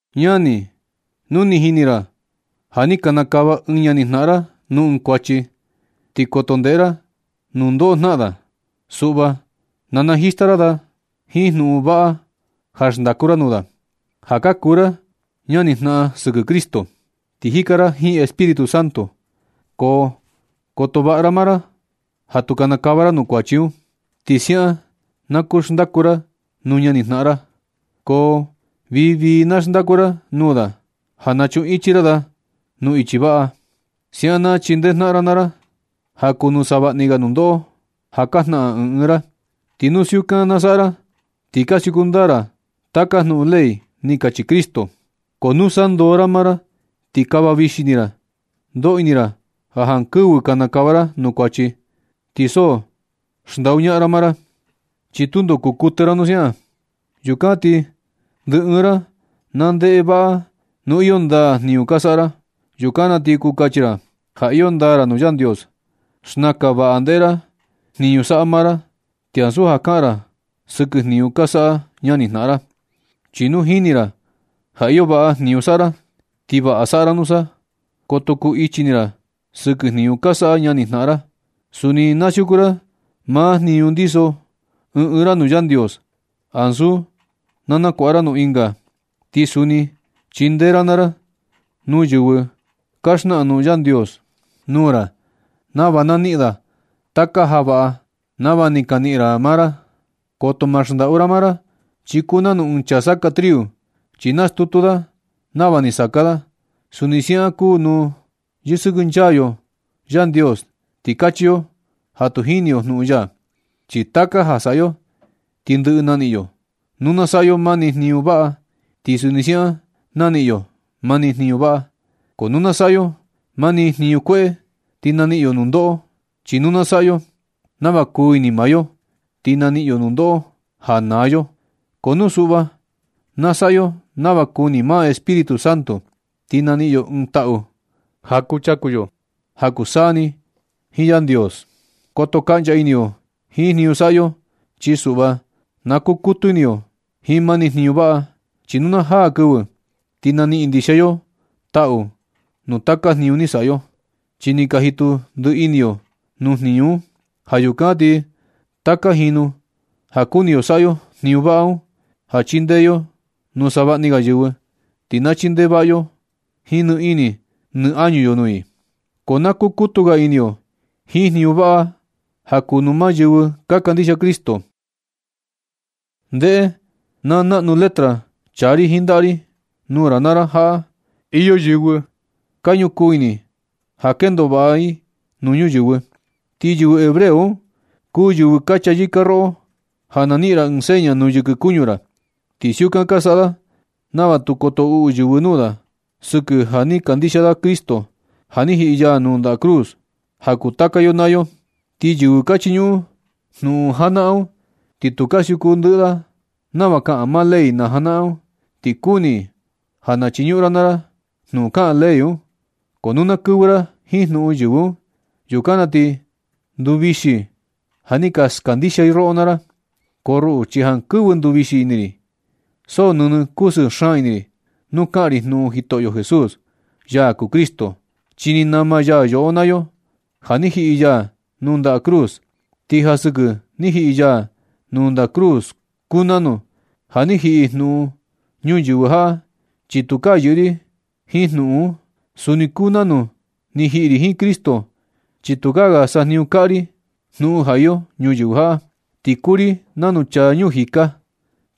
Ñani, nu ni jini ra ja ni kinikava ɨɨn ñani jnaꞌan ra nuu ɨɨn kuachi, ti koto ndeꞌe ra nundoꞌo jnaꞌan da. Suꞌva na najista ra da jiin jnuꞌun vaꞌa ja xndaku ra nuu da, ja ka kuu ra ñani jnaꞌan sɨkɨ Cristo, ti jika ra jiin Espíritu Santo. Ko koto vaꞌa ra maa ra ja tu kinikava ra nuu kuachi un. Ti siaꞌan na kuu xndaku ra nuu ñani jnaꞌan ra, ko vii vii na xndaku ra nuu da ja nachunꞌun ichi ra da nuu ichi vaꞌa. Siaꞌan na chindee jnaꞌan ra naa ra ja kuu nuu savaꞌni ga nundoꞌo ja ka jnaꞌan ɨɨn ɨɨn ra. Ti nu siukan na saꞌa ra, ti ka siuku ndaa ra taka jnuꞌun kuu ley ni kachi Cristo. Ko nu sandoo ra maa ra ti kava vixi ini ra ndoꞌo ini ra ja jankɨvɨ kinikava ra nuu kuachi, ti so xndaꞌu ra maa ra. Chi tundo kuu kuɨtɨ ra nu siaꞌan. Yukan ti ndɨ ɨɨn ra na ndeꞌe vaꞌa nu iyo ndaa jniñu ka saꞌa ra. Yukan na ti kuu kachi ra ja iyo ndaa ra nuu Yandios. Xnakan vaꞌa ndeꞌe ra jniñu saꞌa maa ra, ti ansu ja kaꞌan ra sɨkɨ jniñu ka saꞌa ñani jnaꞌan ra. Chi nu jini ra ja iyo vaꞌa jniñu saꞌa ra, ti vaꞌa saꞌa ra nusa, ko tu kuu ichi ini ra sɨkɨ jniñu ka saꞌa ñani jnaꞌan ra. Suni na siuku ra maa jniñu ndiso ɨɨn ɨɨn ra nuu Yandios, ansu na nakuaꞌa ra nuu ɨnga. Ti suni chindee ra naa ra nuu yɨvɨ ka xnaꞌan jnuꞌun Yandios nuu ra, nava na niꞌin da taka ja vaꞌa nava ni ka niꞌin ra naa ra. Koto ma xndaꞌu ra maa ra, chi kuu nanu ɨɨn chaa saka triu, chi nastutu da nava ni saka da. Suni siaꞌan kuu nu kusɨkɨnchaa yo Yandios ti kachi yo ja tu jini yo jnuꞌun ya. Chi taka ja saꞌa yo, ti ndɨꞌɨ naniꞌin yo. Nu na saꞌa yo mani jniñu vaꞌa ti suni siaꞌan naniꞌin yo mani jniñu vaꞌa. Ko nu na saꞌa yo mani jniñu kueꞌe, ti naniꞌin yo nundoꞌo. Chi nu na saꞌa yo nava kuu ini maa yo, ti naniꞌin yo nundoꞌo ja naa yo. Ko nu suꞌva na saꞌa yo nava kuu ini maa Espíritu Santo, ti naniꞌin yo ɨɨn taꞌu ja kuchaku yo ja kuu taka saa ni jiin Yandios. Koto kaꞌncha ini yo jiin jniñu saꞌa yo, chi suꞌva na kukutu ini yo jiin mani jniñu vaꞌa. Chi nu na jaa kɨvɨ, ti naniꞌin ndixia yo taꞌu nuu taka jniñu ni saꞌa yo, chi ni ka jitu ndiꞌi ini yo nuu jniñu un. Ja yukan ti taka jinu ja kuni yo saꞌa yo jniñu vaꞌa un, ja chindee yo nuu savaꞌni ga yɨvɨ, ti na chindee vaꞌa yo jiin ni ini ni añu yo nuu i. Ko na kukutu ga ini yo jiin jniñu vaꞌa un ja kuu nuu maa yɨvɨ ka kandixia Cristo. Ndeꞌe naa naꞌnu letra chaa ri jiin ndaꞌa ri nuu ra naa ra jaꞌa. Iyo yɨvɨ ka ñukuu ini ja kendo vaꞌa i nuu yɨvɨ. Ti yɨvɨ hebreo un kuu yɨvɨ ka chayɨka roꞌo ja na niꞌin ra ɨɨn seña nuu yɨkɨ kuñu ra. Ti siukan ka saꞌa da nava tu koto uꞌu yɨvɨ nuu da sɨkɨ ja ni kandixia da Cristo, ja ni jiꞌi ya nuu ndaꞌa cruz ja kuu taka yo naa yo. Ti yɨvɨ ka chiñuꞌun jnuꞌun janaꞌan un, ni tu ka siuku ndɨꞌɨ i nava kaꞌan maa ley najanaꞌan un. Ti kuni i ja na chiñuꞌun ra naa ra jnuꞌun kaꞌan ley un. Ko nu na kɨvɨ ra jiin jnuꞌun yɨvɨ un, yukan na ti nduvixi i ja ni ka skandixia i roꞌo naa ra. Ko ruꞌu chi jankɨvɨ nduvixi ini ri, so nɨnɨ kusɨɨ xaan ini ri nu kaꞌan ri jnuꞌun Jitoꞌyo Jesús, ya kuu Cristo, chi ni nama ya yoꞌo naa yo ja ni jiꞌi ya nuu ndaꞌa cruz. Ti ja sɨkɨ ni jiꞌi ya nuu ndaꞌa cruz kuu nanu ja ni jiꞌi jnuꞌun ñuyɨvɨ jaꞌa, chi tukaa yɨꞌɨ ri jiin jnuꞌun un. Suni kuu nanu ni jiꞌi ri jiin Cristo, chi tukaa sajniñu kaꞌa ri jnuꞌun ja iyo ñuyɨvɨ jaꞌa. Ti kuu ri nanu chaa ñuu jika,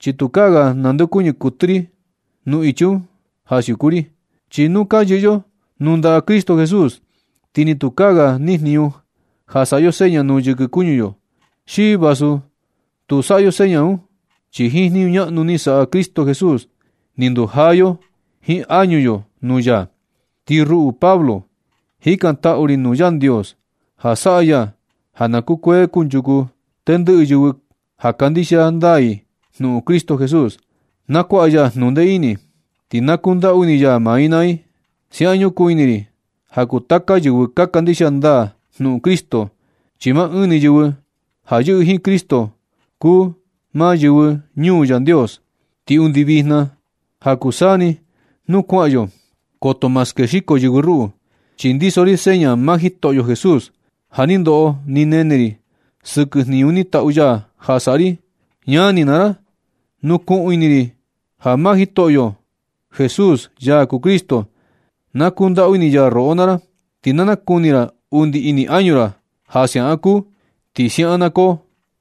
chi tukaa ga nandeokuñɨ kuɨtɨ ri nuu ichi un ja siuku ri. Chi nu ka yɨꞌɨ yo nuu ndaꞌa Cristo Jesús, ti ni tukaa ga nijniñu ja saꞌa yo seña nuu yɨkɨ kuñu yo, xi vasu tu saꞌa yo seña un. Chi jiin jniñu ñaꞌnu ni saꞌa Cristo Jesús ni ndujaa yo jiin añu yo nuu ya. Ti ruꞌu Pablo, jikantaꞌu ri nuu Yandios ja saꞌa ya ja na kukuee kunchuku tendɨꞌɨ yɨvɨ ja kandixia ndaa i jnuꞌun Cristo Jesús. Na kuaꞌa ya jnuꞌun ndee ini, ti na kundaꞌu ini ya maa i naa i. Siaꞌan ñukuu ini ri ja kuu taka yɨvɨ ja kandixia ndaa jnuꞌun Cristo, chi maa ɨɨn ni yɨvɨ ja yɨꞌɨ jiin Cristo kuu maa yɨvɨ ñuu Yandios. Ti undi vijna jiin ja kuu taka saa ni nuu kuaꞌan yo, koto ma skexiko yɨvɨ ruꞌu. Chi ndiso ri seña maa Jitoꞌyo Jesús ja ni ndoꞌo ni nene ri sɨkɨ jniñu ni tatu ya ja saꞌa ri. Ñani naa ra, ñukuu ini ri ja maa Jitoꞌyo Jesús, ya kuu Cristo, na kundaꞌu ini ya roꞌo naa ra. Ti na nakuni ra undi ini añu ra ja siaꞌan kuu. Ti siaꞌan na koo.